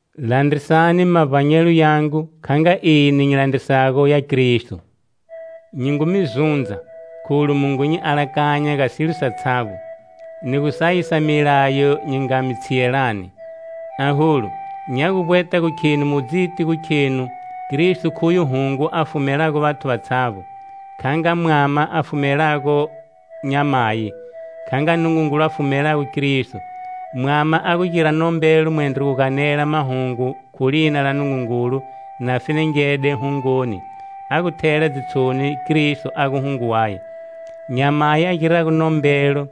Landrisani mavbanyelo yangu kha nga eni nyi landrisago ya Kristo. Nyi ngu mi zundza, kholu mu ngu nyi alakanya ga silo satshavbo, ni gu sayisa milayo nyi nga mi tshiyelani. Aholu, nya gu vbweta gu kheni mu dzitini gu khenu Kristo khuye hungo a fumelago vathu vatshavbo, kha nga mwama a fumelago nyamayi, kha nga Nungungulu a fumelago Kristo. Mwama a gu gira nombelo mwendro gu ganela mahungu khu lina la Nungungulu na fenengede hungoni, a gu thela dzitshoni Kristo a gu hungo waye. Nyamayi a girago nombelo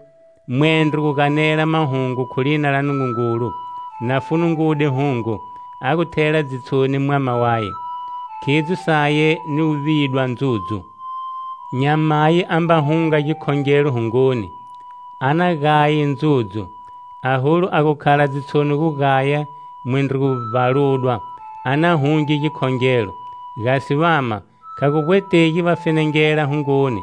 mwendro gu ganela mahungu khu lina la Nungungulu na funungude hungo, a gu thela dzitshoni mwama waye, khidzo saye ni gu vidwa ndzudzu. Nyamayi a mba hunga gikhongelo hungoni, a na gaye ndzudzu! Aholu a gu khala dzitshoni gu gaya mwendro gu vbaludwa, a na hunge gikhongelo! Gasi vama, kha gu vbwetegi va fenengela hungoni,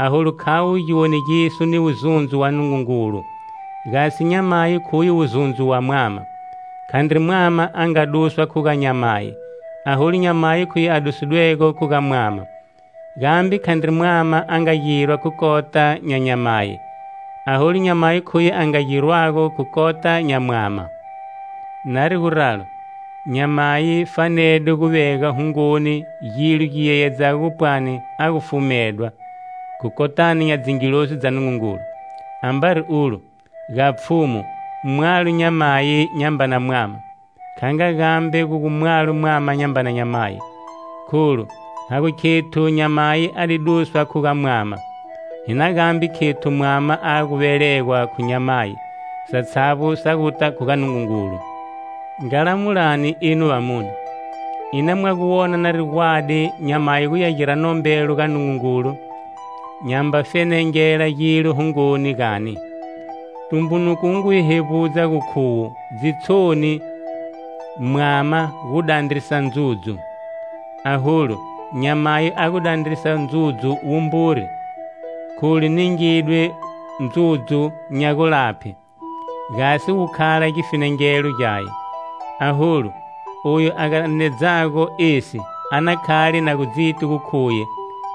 kholu khavo giwonegiso ni wuzundzo wa Nungungulu, gasi nyamayi khuye wuzundzo wa mwama. Khandri mwama a nga duswa khu ga nyamayi, aholu nyamayi khuye a dusidwego khu ga mwama. Gambe khandri mwama a nga girwa khu kota nya nyamayi, aholu, nyamayi khuye a nga girwago khu kota nya mwama. Nari guralo, nyamayi fanede gu vega hungoni gilo gi yeyedzago gu pwani a gu fumedwa, khu kotani nya dzingilozi Nungungulu. Ambari ulo, ga Pfhumu, mwalo nyamayi nyambana mwama, kha nga gambe a gu mwalo mwama nyambana nyamayi. Kholu ha gu khethu nyamayi a di duswa khu ga mwama, hi na gambe khethu mwama a gu velegwa khu nyamayi. Satshavbo sa guta khu ga Nungungulu. Nga lamulani enu vamune: Ina mwa gu wona nari gwadi nyamayi guya gira nombelo ga Nungungulu nyamba fenengela gilo hungoni, gani? Tumbunuko wu ngu hi hevbudza gu khuwo dzitshoni mwama gu dandrisa ndzudzu. Aholu, nyamayi a gu dandrisa ndzudzu wumburi, kholu ningidwe ndzudzu nya gulaphe gasi wu khala gifenengelo gyaye. Aholu, oyu a ganedzago esi a na khale na gu dziti gu khuye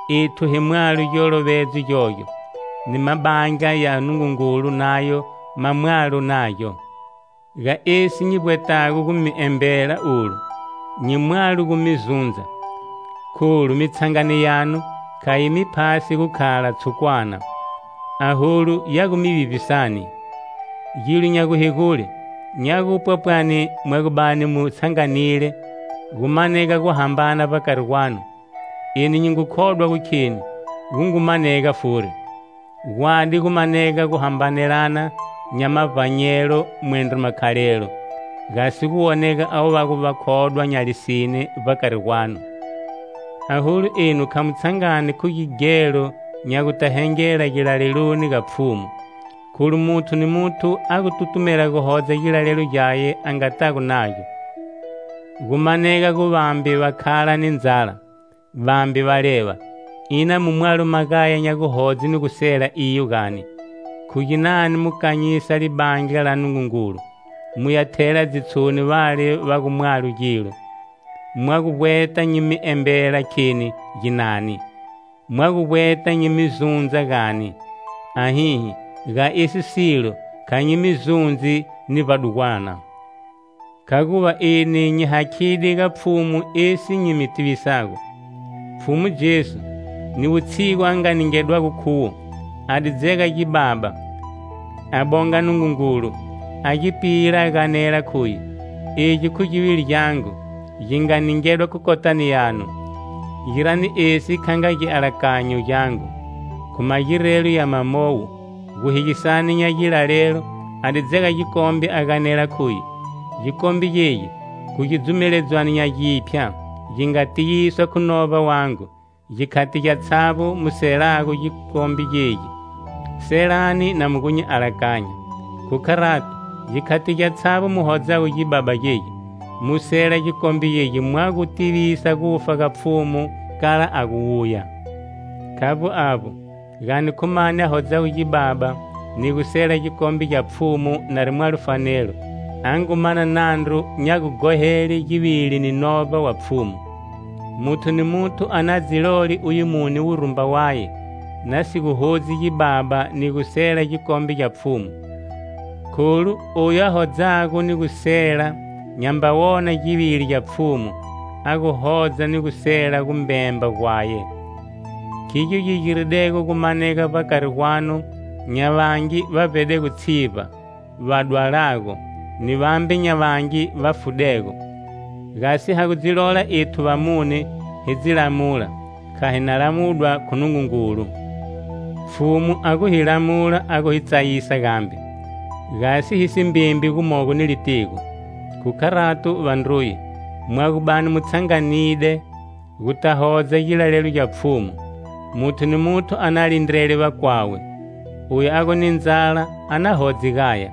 ethu hi mwalo giolovedzo gyogyo, ni mabandla ya Nungungulu nayo ma mwalo nagyo. Ga esi nyi vbwetago gu mi embela olu, nyi mwalo gu mi zundza. Kholu mitshangano yanu kha yi mi phasi gukhala tshukwana, aholu ya gu mi vivbisani. Gilo nya guhegule, nya gupwa pwani mwa gu bani mu tshanganile gu manega guhambana vbakari gwanu. Eni nyi ngu khodwa gu kheni, gu ngu manega furi. Gwadi gu manega guhambanelana nya mavbanyelo mwendro makhalelo, gasi gu wonega avo va gu vakhodwa nya lisine vbakari gwanu. Aholu enu kha mu tshangani khu gighelo nya guta hengela gilaleloni ga Pfhumu, Kholu muthu ni muthu a gu tutumela gu hodza gilalelo gyaye a ngatago nagyo, gu manega gu vambe va khala ni ndzala, vambe va leva. Ina mu mwalo magaya nya gu hodze ni gu sela iyo, gani? Khu ginani mu kanyisa libandla la Nungungulu, muya thela dzitshoni vale va gu mwalo gilo? Mwa gu vbweta nyi mi embela kheni ginani? Mwa gu vbweta nyi mi zundza, gani? Ahihi, ga esi silo kha nyi mi zundzi ni vbadugwana! Khaguva eni nyi hakhide ga Pfhumu esi nyi mi tivisago: Pfhumu Jesu, ni wutshigu a nga ningedwago khuwo, a di dzega gibaba, a bonga Nungungulu, a gi pila a ganela khuye: "Egi khu givili gyangu gi nga ningedwa khu kotani yanu. Girani esi kha nga gialakanyo gyangu". Khu magirelo ya mamowo, guhegisani nya gilalelo a di dzega gikombe a ganela khuye: "Gikombe gegi khu gidzumeledzwano nya giphya gi nga tiyiswa khu novba wangu; gikhati gyatshavbo mu selago gikombe gegi, selani na mu gu nyi alakanya." Khu kharato, gikhati gyatshavbo mu hodzago gibaba gegi, mu sela gikombe gegi mwa gu tivisa gufa ga Pfhumu kala a gu wuya. Khavbo avbo, gani khu mani a hodzago gibaba ni gu sela gikombe gya Pfhumu nari mwalo fanelo, a ngu mana nandru nya gughohele Givili ni Novba wa Pfhumu. Muthu ni muthu a na dzi lole uye mune wurumba waye, na si gu hodzi gibaba ni gu sela gikombe gya Pfhumu. Kholu oyu a hodzago ni gu sela nyamba wona Givili gya Pfhumu, a gu hodza ni gu sela gumbemba gwaye. Khigyo gi giridego gumanega vbakari gwanu nya vangi va vbedego tshivba, va dwalago, ni vambe nya vangi va fudego. Gasi ha gu dzi lola ethu vamune hi dzi lamula, kha hi na lamudwa khu Nungungulu. Pfhumu a gu hi lamula a gu hi tsayisa gambe, gasi hi si mbembi gumogo ni litigo. Khu kharato, vandruye, mwa gu bani mu tshanganide, guta hodza gilalelo gya Pfhumu, muthu ni muthu a na lindrele vakwawe. Oyu a gu ni ndzala a na hodze gaya,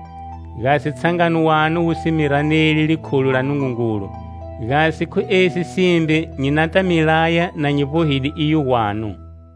gasi tshangano wanu wu si mi raneli likhulo la Nungungulu. Gasi khu esi simbe nyi nata mi laya na nyi vbohide iyo gwanu.